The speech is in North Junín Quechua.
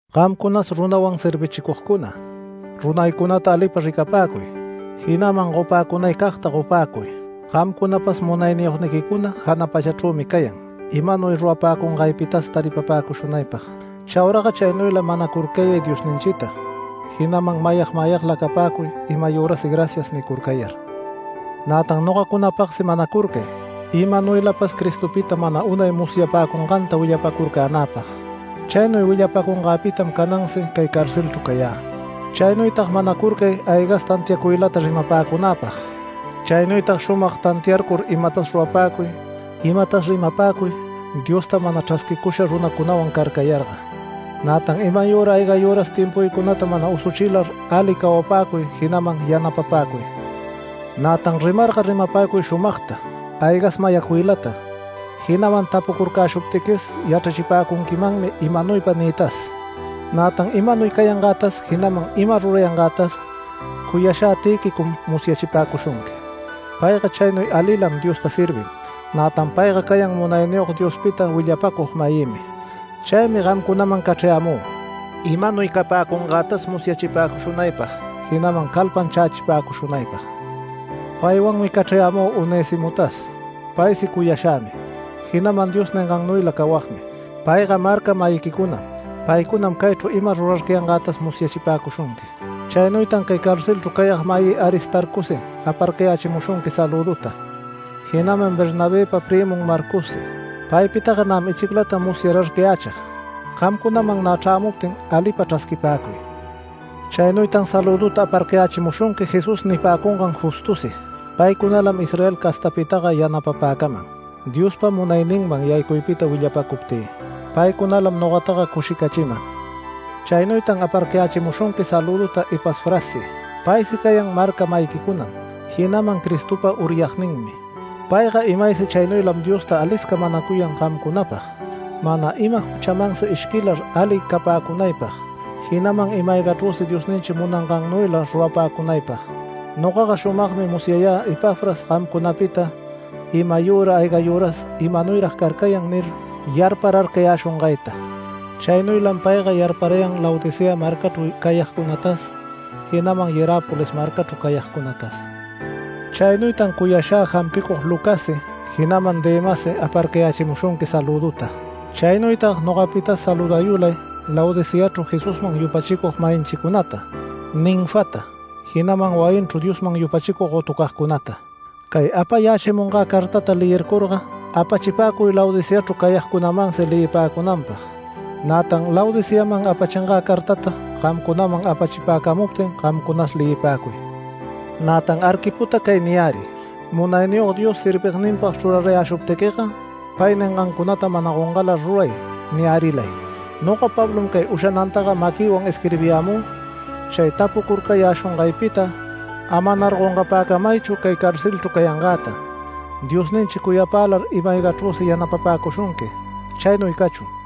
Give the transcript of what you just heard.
Gamcunas runawan servichicugcuna, runaycunata alipa ricapäcuy, jinaman gopäcunaycagta gopäcuy. Gamcunapas munayniyogniquicuna jana pachachrümi cayan, imanuy rurapäcungaypitas taripapäcushunaypag. Chauraga chaynuyla manacurcayay Diosninchita, jinaman mayag mayagla capäcuy, imayürasi “Gracias” nicurcayar. Nätan nogacunapagsi manacurcay imanuylapas Cristopita mana unay musyapäcunganta willapacurcänäpag. Chaynuy willapacungäpitam canansi cay carcelchru cayä. Chaynuytag manacurcay aygas tantiacuylata rimapäcunäpag. Chaynuytag shumag tantiarcur imatas rurapäcuy imatas rimapäcuy Diosta mana chrasquicusha runacunawan carcayarga, nätan imayüra aygayüras timpuycunata mana usuchilar ali cawapäcuy, jinaman yanapapäcuy. Nätan rimarga rimapäcuy shumagta, aygas mayacuylata, jinaman tapucurcäshuptiquis yachrapäcunquimanmi imanuypa niytas. Nätan imanuy cayangätas, jinaman ima rurayangätas, cuyashä Tïquicom musyachipäcushunqui. Payga chaynuy alilam Diosta servin, nätan payga cayan Munayniyog Diospita willapacug-mayïmi. Chaymi gamcunaman cachrayämü, imanuy capäcungätas musyachipäcushunaypag, jinaman calpanchächipäcushunaypag. Paywanmi cachrayämü Onesimotas. Paysi cuyashämi, jinaman Dios ningannuyla cawagmi. Payga marca-mayiquicunam. Paycunam caychru ima rurarcayangätas musyachipäcushunqui. Chaynuytan cay carcelchru cayag mayï Aristarcosi aparcayächimushunqui salüduta, jinaman Bernabëpa prïmun Marcossi. Paypitaga nämi ichiclata musyararcayächig, gamcunaman nä chrämuptin alipa chrasquipäcuy. Chaynuytan salüduta aparcayächimushunqui Jesús nipäcungan Justosi. Paycunalam Israel castapitaga yanapapäcaman Diospa munayninman yaycuypita willapacuptï. Paycunalam nogataga cushicachiman. Chaynuytan aparcayächimushunqui salüduta Epafrassi. Paysi cayan marca-mayiquicunam, jinaman Cristopa uryagninmi. Payga imaysi chaynuylam Diosta alisca manacuyan gamcunapag, mana ima juchamansi ishquilar ali capäcunaypag, jinaman ima-aygachrüsi Diosninchi munangannuyla rurapäcunaypag. Nogaga shumagmi musyayä Epafras gamcunapita imayüra aygayüras “¿Imanuyrag carcayan?” nir yarpararcayäshungayta. Chaynuylam payga yarparayan Laodicea marcachru cayagcunatas, jinaman Hierápolis marcachru cayagcunatas. Chaynuytan cuyashä jampicug Lucassi, jinaman Demassi aparcayächimushunqui salüduta. Chaynuytag nogapitas saludayulay Laodiceachru Jesusman yupachicug-mayinchicunata, Ninfata, jinaman wayinchru Diosman yupachicug gotucagcunata. Cay apayächimungä cartata leyircurga apachipäcuy Laodiceachru cayagcunamansi leyipäcunanpag. Nätan Laodiceaman apachingä cartata gamcunaman apachipäcamuptin, gamcunas leyipäcuy. Nätan Arquipota cay niyäriy: “Munayniyog Dios servigninpag chrurarayäshuptiquiga, pay ningancunata mana gongalar ruray” niyärilay. Noga Pablom cay ushanantaga maquïwan isquirbiyämü chay tapucurcayäshungaypita. Amanar gongapäcamaychu cay carcelchru cayangäta. Diosninchi cuyapälar ima-aygachrüsi yanapapäcushunqui. Chaynuy cachun.